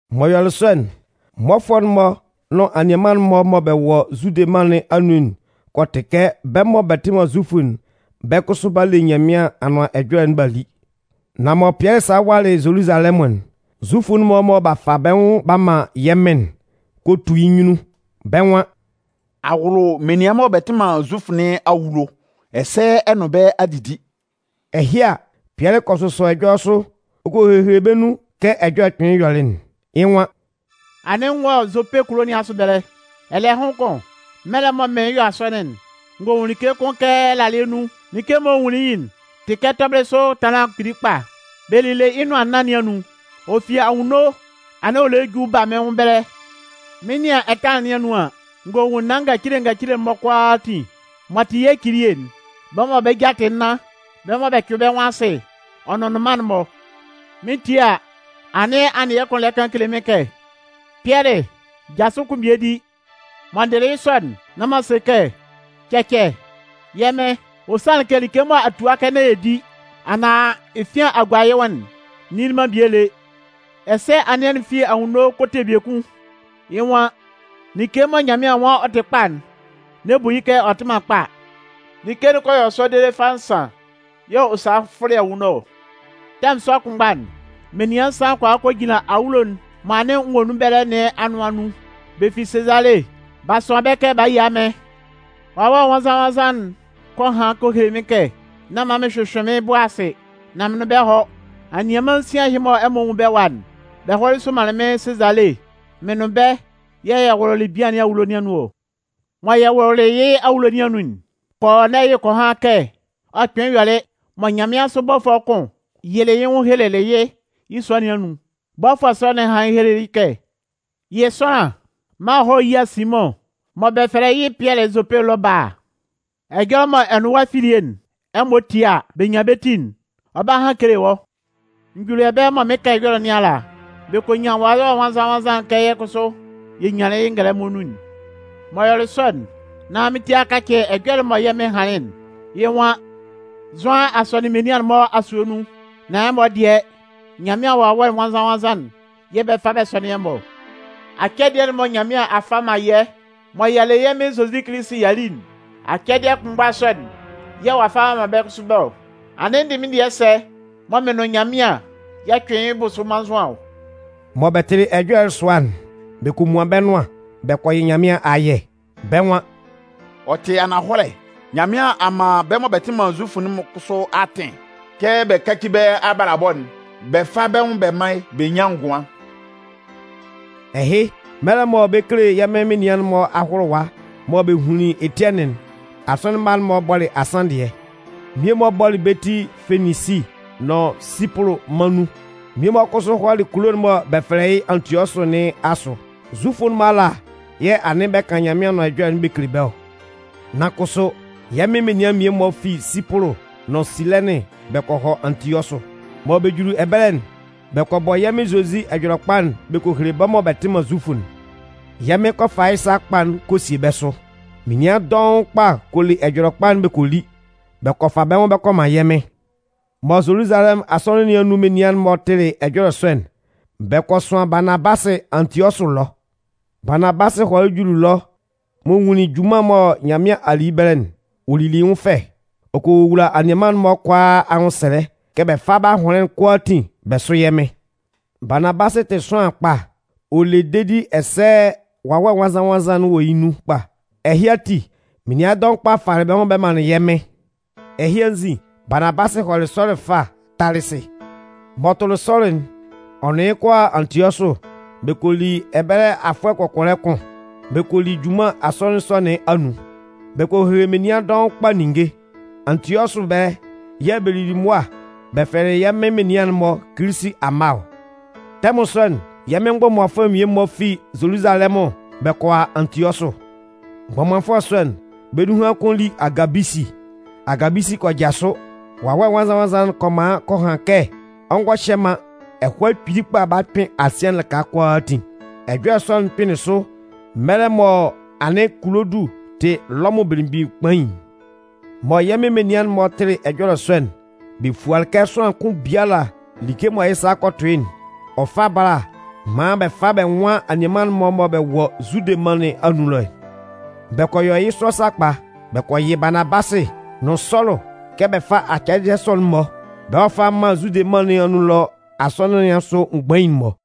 M'ɔ yɔlɩ sɔ'n, mmɔfʋɛ'n-mɔ nʋn anianman'n-mɔ mɔ bɛ wɔ Zude mân nɩn anun'n kɔ tɩ kɛ bɛ́ mɔ bɛ tɩ man Zufʋ'n, bɛ́ kʋsʋ b'a le Nyanmɩan Anʋan Ɛjɔlɛ'n b'a li. Nan mɔ Pɩɛlɩ salɩ walɩ Zoluzalɛmʋn'n, Zufʋ'n-mɔ mɔ b'a fa bɛ́ nwʋn b'a man yɛ́ Mɩn'n kɔ tu yɩ́ nyunnun. Bɛ́ nwan: “A wʋlʋ menian mɔ bɛ tɩ man Zufʋ nɩn awulo, ɛsɛ ɛ nʋn bɛ́ a didi!” Ɛhɩ a, Pɩɛlɩ kɔ sʋsɔ ɛjɔlɛ sʋ ɔ kɔ hehele bɛ́ nun kɛ ɛjɔlɛ'n kpɩnlɩn yɔlɩ'n. Yɩ́ nwan: “Anɩn n wɔ Zope kulo nɩn asʋ ɛbɛlɛ. Ɛlɛhʋn kʋn, mɛlɛ mɔ mɩn 'yɔ asɔnɩn'n, n gɔ nwun like kʋn kɛ ɛlalɩɛ nun. Like'n mɔ n nwunlin yɩ'n tɩ kɛ tɔbɩlɩ sʋ ɛtanlan kpili kpa. Bɛ lile yɩ́ nʋan nnan nɩn anun, ɔ fi anwunno anɩn ɔ lɛ ju ba mɩ́n nwʋn ɛbɛlɛ. Mɩn 'nɩan ɛtanlan nɩn anun an, n gɔ nwun naan ngacile ngacile'n-mɔ kʋalaatin m'ɔ tɩ yɛ́ cilie'n. Bɛ́ mɔ bɛ́ ja tɩ nnan, bɛ́ mɔ bɛ cʋɩn bɛ́ nwʋn asɩ ɔ nʋn nnʋnman'n-mɔ. Mɩn 'tie a, anɩn anɩɛ kʋn lɛ kan kele mɩ́n kɛ: ‘Pɩɛlɩ, jasʋ kun bie di!’ “Mɔ n dɩlɩ yɩ́ sɔ'n, nán m'an se kɛ: ‘Cɛcɛ, yɛ́ Mɩn! Ɔ sanlɩn kɛ like mɔ a tua kɛ nán yɛ di anaan efian a gua yɩ́ nwʋn'n, n nili man bie lé.’ “Ɛsɛ anɩɛ'n fi anwunno ɔ kɔ te biekun. Yɩ́ nwan: ‘Like mɔ Nyanmɩan nwan ɔ tɩ kpa'n, n'ɛ bu yɩ́ kɛ ɔ tɩ man kpa.’ Like'n kɔ yɔ sɔ dede fâ nsan yɛ̂ ɔ salɩ fʋlɩ anwunno ɔ. “Tɛmʋn sɔ kʋnmgba'n, menian nsan kɔ a kɔ jinlan awulo'n mɔ anɩn n wɔ nun ɛbɛlɛ nɩn anʋan nun. Bɛ fi Sezale. B'a sʋan bɛ́ kɛ b'a a yia mɩ́n. Wawɛ Nwannzan-nwannzan'n kɔ han kɔ hele mɩ́n kɛ nán man mɩn hyʋhyʋɩn mɩ́n bʋ asɩ, nán mɩn nʋn bɛ́ hɔ́. Anianman nsian ɛhɩ mɔ ɛmɔ nwun bɛ́ ɛwa'n, bɛ hɔlɩ somanlɩn mɩ́n Sezale. Mɩn nʋn bɛ́ yɛ̂ yɛ wʋlʋlɩ bian nɩn awulo nɩn anun ɔ. Mɔ yɛ wʋlʋlɩ yɩ́ awulo nɩn anun'n, Kɔɔnɛyɩ kɔ han kɛ ɔ kpɩnlɩn yɔlɩ mɔ nyanmɩansʋ bɔfʋɛ kʋn yɩlɩ yɩ́ nwʋn helelɩ yɩ́ yɩ́ sua nɩn anun. Bɔfʋɛ sɔ'n hanlɩn helelɩ yɩ́ kɛ: ‘Yɩ sʋanlan maan ɔ hɔ́ yía Simʋn mɔ bɛ fɛlɛ yɩ́ Pɩɛlɩ Zope ɛlɔ bála. Ɛjɔlɛ mɔ ɛ nʋn wɔ́ afilie'n, ɛmɔ tie a, bɛ 'nyan bɛ́ ti'n, ɔ 'ba han kele wɔ́.’ “N juli ɛbɛlɛ mɔ mɩn 'kan ɛjɔlɛ nɩn ala, bɛ kɔ nyan Wawɛ Nwannzan-nwannzan'n kɛ yɛ́ kʋsʋ yɛ nyanlɩn yɩ́ ngɛlɛmɔ nun'n. M'ɔ yɔlɩ sɔ'n, nán mɩ́n ti a kacɩ ɛjɔlɛ'n mɔ yɛ́ Mɩn hanlɩn'n. Yɩ́ nwan: ‘Zʋan a sɔnɩn menian'n-mɔ asue nun, nán ɛmɔ dɩɛ, Nyanmɩan Wawɛ Nwannzan-nwannzan'n yɛ̂ bɛ 'fa bɛ sɔnɩn ɛmɔ ɔ.’ Acɛdɩɛ'n mɔ Nyanmɩan a fa a man yɛ́ mɔ y'a le yɛ́ Mɩn Zozi Kilisi y'a li'n, acɛdɩɛ kʋnmgba sɔ'n yɛ̂ ɔ'a fa ɔ'a man bɛ́ kʋsʋ bɛ́ ɔ. Anɩn n dɩ mɩ́n dɩɛ sɛ mɔ mɩn nʋn Nyanmɩan yɛ 'cʋɩn yɩ́ bʋsʋ mannzʋan ɔ?” Mɔ bɛ tɩlɩ ɛjɔlɛ'n sʋa'n, bɛ kɔ muan bɛ́ nʋan bɛ kɔ yɩ Nyanmɩan ayɛ. Bɛ́ nwan: “Ɔ tɩ ananhɔlɛ, Nyanmɩan a man bɛ́ mɔ bɛ tɩ man Zufʋ'n kʋsʋ atɩn kɛ bɛ káci bɛ́ abalabɔ'n bɛ fá bɛ́ nwʋn bɛ mán yɩ́ bɛ nyán ngʋan.” Ɛhɩ, mɛlɛ mɔ bɛ 'kele yɛ́ Mɩn menian'n-mɔ ahʋlʋwa mɔ bɛ hunlin Etiɛnɩn'n, asɔnɩn mma'n-mɔ bɔlɩ asanndɩɛ. Mmie-mɔ bɔlɩ bɛ́ ti Feninsi nʋn Sipʋlʋ mân nun. Mmie-mɔ kʋsʋ hɔlɩ kulo'n mɔ bɛ fɛlɛ yɩ́ Antiɔsʋ nɩn asʋ. Zufʋ'n-mɔ ala yɛ̂ anɩn bɛ kan Nyanmɩan Anʋan Ɛjɔlɛ'n bɛ kele bɛ́ ɔ. Nan kʋsʋ, yɛ́ Mɩn menian'n mmie-mɔ fi Sipʋlʋ nʋn Silɛnɩn bɛ kɔ hɔ Antiɔsʋ. Mɔ bɛ juli ɛbɛlɛ'n, bɛ kɔ bɔ yɛ́ Mɩn Zozi Ɛjɔlɛkpa'n bɛ kɔ hele bɛ́ mɔ bɛ tɩ man Zufʋ'n. Yɛ́ Mɩn kɔ fa yɩ́ sa kpa'n kɔ sie bɛ́ sʋ. Menian dɔʋn kpa kɔ le Ɛjɔlɛkpa'n bɔ kɔ li bɛ kɔ fa bɛ́ nwʋn bɛ kɔ man yɛ́ Mɩn. Mɔ Zoluzalɛmʋn asɔnɩn nɩn anun menian'n-mɔ tɩlɩ ɛjɔlɛ sɔ'n, bɛ kɔ sʋan Baanabasɩ Antiɔsʋ ɛlɔ. Baanabasɩ hɔlɩ juli ɛlɔ m'ɔ nwunlin junman'n mɔ Nyanmɩan a li yɩ́ ɛbɛlɛ'n, ɔ lili yɩ́ nwʋn fɛ. Ɔ kɔ wowula anianman'n-mɔ kʋalaa anwʋnsɛlɛ kɛ bɛ fá bɛ́ ahʋnlɩn'n kʋalaatin bɛ sʋ́ yɛ́ Mɩn. Baanabasɩ tɩ sʋanlan kpa, ɔ le dedi ɛsɛ Wawɛ Nwannzan-nwannzan'n wɔ yɩ́ nun kpa. Ɛhɩ ati, menian dɔʋn kpa falɩ bɛ́ nwʋn bɛ manlɩn yɛ́ Mɩn. Ɛhɩ anzin, Baanabasɩ hɔlɩ Sɔlʋ ɛfa Talɩsɩ. M'ɔ tʋlɩ Sɔlʋ'n, ɔ nʋn yɩ́ kɔ a Antiɔsʋ bɛ kɔ li ɛbɛlɛ afʋɛ kɔkɔlɛ kʋn, bɛ kɔ li junman asɔnɩn sɔ nɩn anun. Bɛ kɔ hehele menian dɔʋn kpa ninnge. Antiɔsʋ ɛbɛlɛ yɛ̂ bɛ lili mʋa bɛ fɛlɛlɩ yɛ́ Mɩn menian'n-mɔ “Kilisi amma” ɔ. Tɛmʋn sɔ'n, yɛ́ Mɩn mgbɔmanfʋɛ mmie-mɔ fi Zoluzalɛmʋn bɛ kɔ a Antiɔsʋ. Mgbɔmanfʋɛ sɔ'n, bɛ́ nunhan kʋn li Agabisi. Agabisi kɔ jasʋ, Wawɛ Nwannzan-nwannzan'n kɔ man ɔ kɔ han kɛ ɔ ngɔ hyɛ man, ɛhɔɛ kpili kpa 'ba kpɩn asɩɛ'n lɩka kʋalaatin. Ɛjɔlɛ sɔ'n kpɩnlɩn sʋ mɛlɛ mɔ anɩn Kulodʋ tɩ Lɔmʋn belemgbin kpain'n. Mɔ yɛ́ Mɩn menian'n-mɔ tɩlɩ ɛjɔlɛ sɔ'n bɛ fualɩ kɛ sʋanlan kʋn biala like mɔ yɩ́ sa kɔ tʋ yɩ́'n, ɔ fá bála maan bɛ fá bɛ nwán anianman'n-mɔ mɔ bɛ wɔ Zude mân nɩn anun ɛlɔ'n. Bɛ kɔ yɔ yɩ́ sɔ sakpa. Bɛ kɔ yɩ Baanabasɩ nʋn Sɔlʋ kɛ bɛ fá acɛdɩɛ sɔ'n-mɔ, bɛ hɔ́ fá mán Zude mân nɩn anun ɛlɔ asɔnɩn nɩn asʋ mgbain'n-mɔ.